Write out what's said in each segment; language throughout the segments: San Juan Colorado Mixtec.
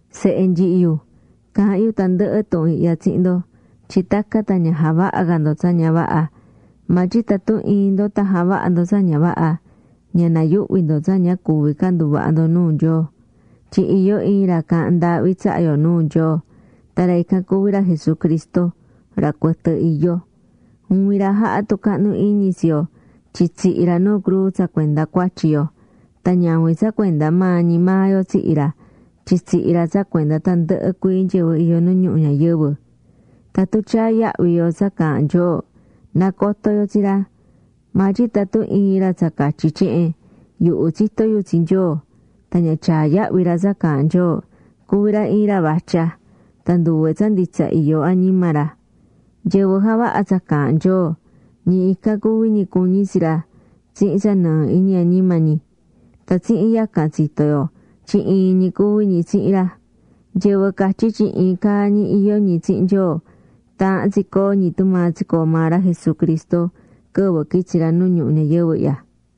Sehe nyihi yu, caahán yu tandɨhɨ tuhun ihya tsihin ndo, tyin tacan tan ña javahá ca ndo tsa ña vaha. Maa tyin tatun iin ndo tan javaha ndo tsa ña vaha, ña nayuhvi ndo tsa ña cuvi ca nduvaha ndo nuu Nyoo, tyin iyó iin ra caahán ndaahvi tsaha yo nuu Nyoo. Tan ra ican cuví ra Jesucristo, ra cuɨtɨ iyó. Juvin ra jahá tucahnu iñi tsi yo tyin tsihi̱ ra nu cruu tsa cuenda cuatyi yo. Tan ñavin tsa cuenda maa ñi maa yo tsihi̱ ra, tyin tsihi̱ ra tsa cuenda tandɨhɨ cuii nyɨvɨ iyó nu ñuhu ñayɨvɨ. Tatun tyaá yahvi yo tsa caahán Nyoo, nacotó yo tsi ra. Maa tyin tatun iin ra tsa catyí tyehen: “Yuhu tsitó yu tsi Nyoo”, tan ña tyaá yahvi ra tsa caahán Nyoo, cuví ra iin ra vatya. Tan nduve tsa nditsa iyó añima ra. Nyɨvɨ javahá tsa caahán Nyoo, ñi ican cuví ñi cuñí tsi ra tsihin tsa nɨɨ iñi añima ñi. Tan tsihin yacan tsitó yo tyin iin ñi cuví ñi tsihin ra. Nyɨvɨ catyí tyin iin caa ñi iyó ñi tsihin Nyoo, taahán tsi coo ñi tumaa tsicoo̱ maa ra Jesucristo quɨvɨ quitsi̱ ra nu ñuhu ñayɨvɨ ihya.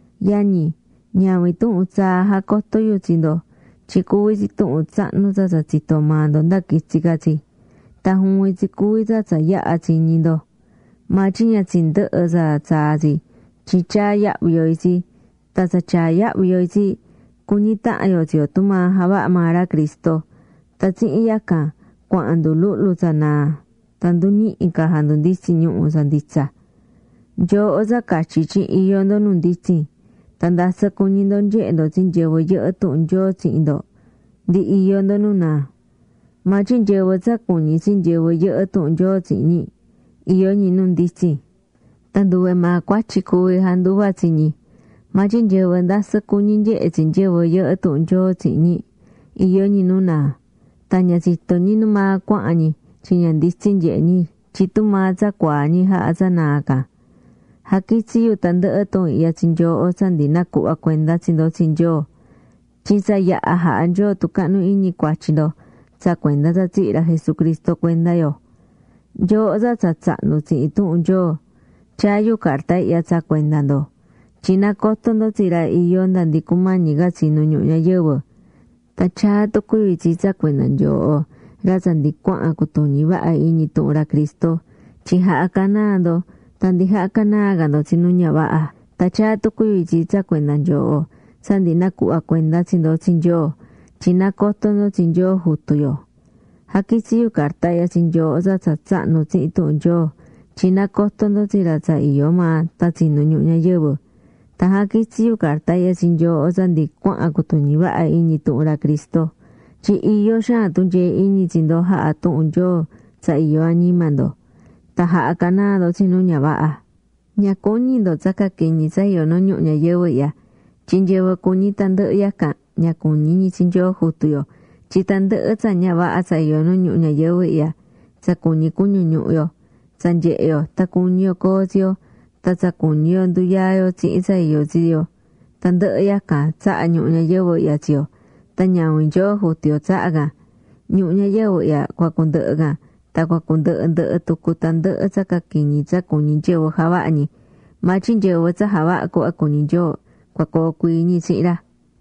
Yañi, ñavin tuhun tsaa jacotó yu tsi ndo, tyin cuví tsi tuhun tsahnu tsa tsa tsitó maa ndo nda quitsi̱ ca tsi. Tan juvin tsi cuví tsa tsa yaha̱ tsiñi̱ ndo. Maa tyin ña tsindɨhɨ́ tsa tsaa tsi tyin tyaá yahvi yo itsi tan tsa tyaá yahvi yo itsi, cuñí tahan yo tsi yo tumaa javahá maa ra Cristo. Tan tsihin yacan cuahán nduluhlu tsa naa tan nduñihi ca jandunditsín ñuhu̱ tsa nditsa. Nyooho tsa catyí tyin iyó ndo nu nditsin, tan ndasɨ cuñí ndo nyehe ndo tsi nyɨvɨ yɨhɨ́ tuhun Nyoo tsihin ndo, ndi iyó ndo nu naa. Maa tyin nyɨvɨ tsa cuñí tsi nyɨvɨ yɨhɨ́ tuhun Nyoo tsihin ñi, iyó ñi nu nditsin. Tan nduve maa cuatyi cuvi janduva tsi ñi. Maa tyin nyɨvɨ ndasɨ cuñí nyehe tsi nyɨvɨ yɨhɨ́ tuhun Nyoo tsihin ñi, iyó ñi nu naa. Tan ña tsitó ñi numaa cuahán ñi tyin ña nditsin nyehé ñi tyin tumaa tsa cuaa̱ ñi jaha̱ tsa naa can. Jaquitsí yu tandɨhɨ tuhun ihya tsi nyooho tsa ndi nacuhva̱ cuenda tsi ndo tsi Nyoo. Tyin tsa yaha̱ jaha̱ Nyoo tucahnu iñi cuatyi ndo tsa cuenda tsa tsihi̱ ra Jesucristo cuenda yo. Nyooho tsa tsa tsahnu̱ tsihin tuhun Nyoo, tyaá yu carta ihya tsa cuenda ndo, tyin nacotó ndo tsi ra iyó nda ndi cumañi ca tsinu ñuhu ñayɨvɨ. Tan tyaá tucu yu itsi tsa cuenda nyooho ra tsa ndi cuahan cutuñí vaha iñi tuhun ra Cristo tyin jaha̱ canaa ndo tan ndi jahá canaa ca ndo tsi nu ña vaha. Tan tyaá tucu yu itsi tsa cuenda nyooho, tsa ndi nacuhva̱ cuenda tsi ndo tsi Nyoo, tyin nacotó ndo tsi Nyoo Jutu yo. Jaquitsí yu carta ihya tsi nyooho tsa tsa tsahnu̱ tsihin tuhun Nyoo, tyin nacotó ndo tsi ra tsa iyó maa tan tsinu̱ ñuhu ñayɨvɨ. Tan jaquitsí yu carta ihya tsi nyooho tsa ndi cuahan cutuñi vaha iñi tuhun ra Cristo, tyin iyó xaan tunyee iñi tsi ndo jahá tuhun Nyoo tsa iyó añima ndo. Tan jaha̱ canaa ndo tsi nu ña vaha. Ña cuñi ndo tsa caquiñi tsa iyó nu ñuhu ñayɨvɨ ihya. Tyin nyɨvɨ cuñí tandɨhɨ yacan, ña cuñí ñi tsi Nyoo Jutu yo. Tyin tandɨhɨ tsa ña vaha tsa iyó nu ñuhu ñayɨvɨ ihya, tsa cuñí cuñu ñuhu yo, tsa nyehé yo tan cuñi yo coo tsi yo, tan tsa cuñi yo nduyaa yo tsihin tsa iyó tsi yo, tandɨhɨ yacan tsahá ñuhu ñayɨvɨ ihya tsi yo, tan ñavin Nyoo Jutu yo tsahá can. Ñuhu ñayɨvɨ ihya cua cundɨhɨ can, tan cua cundɨhɨ ndɨhɨ tucu tandɨhɨ tsa caquiñi tsa cuñí nyɨvɨ javaha ñi. Maa tyin nyɨvɨ tsa javahá cuhva cuñí Nyoo, cua coo cuii ñi tsihin ra.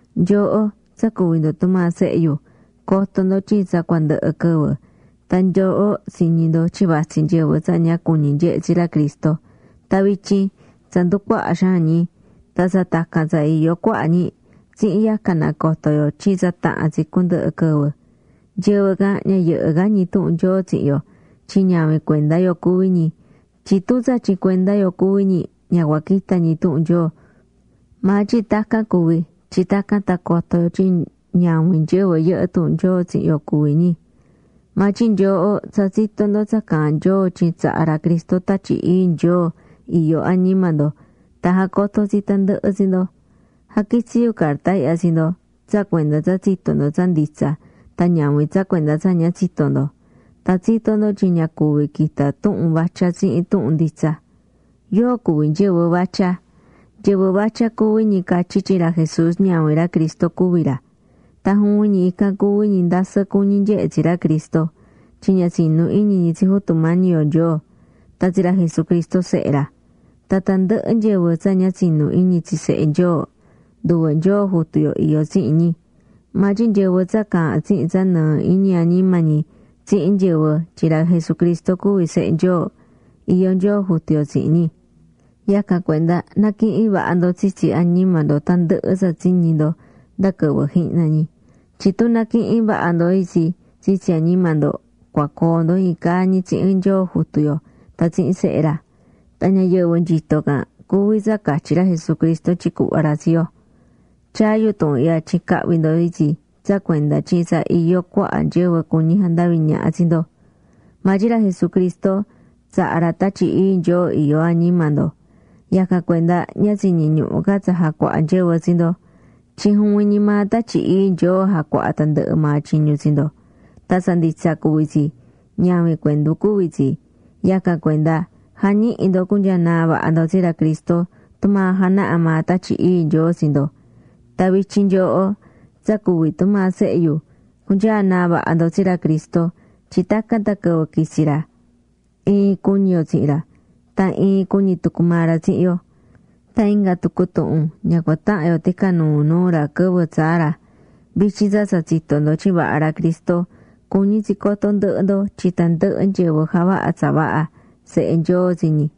Nyooho, tsa cuví ndo tumaa sehe yu, co̱to ndo tyin tsa cua ndɨhɨ quɨvɨ. Tan nyooho tsiñi̱ ndo tyin vatsí nyɨvɨ tsa ña cuñí nyehe tsi ra Cristo, tan vityin tsa nducuahá xaan ñi. Tan tsa tacan tsa iyó cuaha ñi. Tsihin yacan nacotó yo tyin tsa taha̱n tsi cundɨhɨ quɨvɨ. Nyɨvɨ can ña yɨhɨ́ ca ñi tuhun Nyoo tsihin yo, tyin ñavin cuenda yo cuví ñi. Tyin tun nditsa ñi tyin cuenda yo cuví ñi, ña cua quita ñi tuhun Nyoo. Maa tyin tacan cuvi̱ tyin tacan tan coto yo tyin ñavin nyɨvɨ yɨhɨ́ tuhun Nyoo tsihin yo cuví ñi. Maa tyin nyooho tsa tsitó ndo tsa caahán Nyoo tyin tsaha̱ ra Cristo Tatyi Ii Nyoo iyó añima ndo tan jacotó tsi tandɨhɨ tsi ndo. Jaquitsí yu carta ihya tsi ndo tsa cuenda tsa tsitó ndo tsa nditsa tan ñavin tsa cuenda tsa ña tsitó ndo. Tan tsitó ndo tyin ña cuvi quita tuhun vatya tsihin tuhun nditsa. ¿Yóo cuví nyɨvɨ vatya? Nyɨvɨ vatya cuví ñi catyí tyin ra Jesús ñavin ra Cristo cuví ra. Tan juvin ñi ican cuví ñi ndasɨ cuñi nyehé tsi ra Cristo. Tyin ña tsinú iñi ñi tsi Jutu yo Nyoo, tan tsi ra Jesucristo Sehe ra. Tan tandɨhɨ nyɨvɨ tsa ña tsinú iñi tsi Sehe Nyoo, nduve Nyoo Jutu yo iyó tsihin ñi. Maa tyin nyɨvɨ tsa caahán tsihin tsa nɨɨ iñi añima ñi tsihin nyɨvɨ tyin ra Jesucristo cuví Sehe Nyoo, iyó Nyoo Jutu yo tsihin ñi. Yacan cuenda na̱quihin vaha ndo tsitsi añima ndo tandɨhɨ tsa tsiñi̱ ndo nda quɨvɨ jihna ñi. Tyin tun naquihin vaha ndo itsi tsitsi añima ndo, cua coo ndo iin caa ñi tsihin Nyoo Jutu yo tan tsihin Sehe ra. Tan ñayɨvɨ nyito can cuví tsa catyí ra Jesucristo tyin cuhva ra tsi yo. Tyaá yu tuhun ihya tyin cahvi ndo itsi tsa cuenda tyin tsa iyó cuaha nyɨvɨ cuñi jandaví ñaha tsi ndo. Maa tyin ra Jesucristo tsaha̱ ra Tatyi Ii Nyoo iyó añima ndo, yacan cuenda ña tsiñí ñuhu ca tsa jacuaha nyɨvɨ tsi ndo. Tyin juvin ñi maa Tatyi Ii Nyoo jacuahá tandɨhɨ maa tyiñu tsi ndo. Tan tsa nditsa cuví tsi, ñavin cuendu cuví tsi. Yacan cuenda ja̱ñihi ndo cunyanaa vaha ndo tsi ra Cristo tumaa janahá maa Tatyi Ii Nyoo tsi ndo. Tan vityin nyooho, tsa cuví tumaa sehe yu, cu̱nyanaa vaha ca ndo tsi ra Cristo tyin tacan tan quɨvɨ quitsi ra, iin cuñi yo tsihin ra. Tan iin cuñi tucu maa ra tsihin yo. Tan inga tucu tuhun ña cua tahan yo ticanuu nuu ra quɨvɨ tsaa ra. Vityin tsa tsa tsitó ndo tyin vaha ra Cristo, cuñí tsi coto ndɨhɨ ndo tyin tandɨhɨ nyɨvɨ javahá tsa vaha, sehe Nyoo tsi ñi.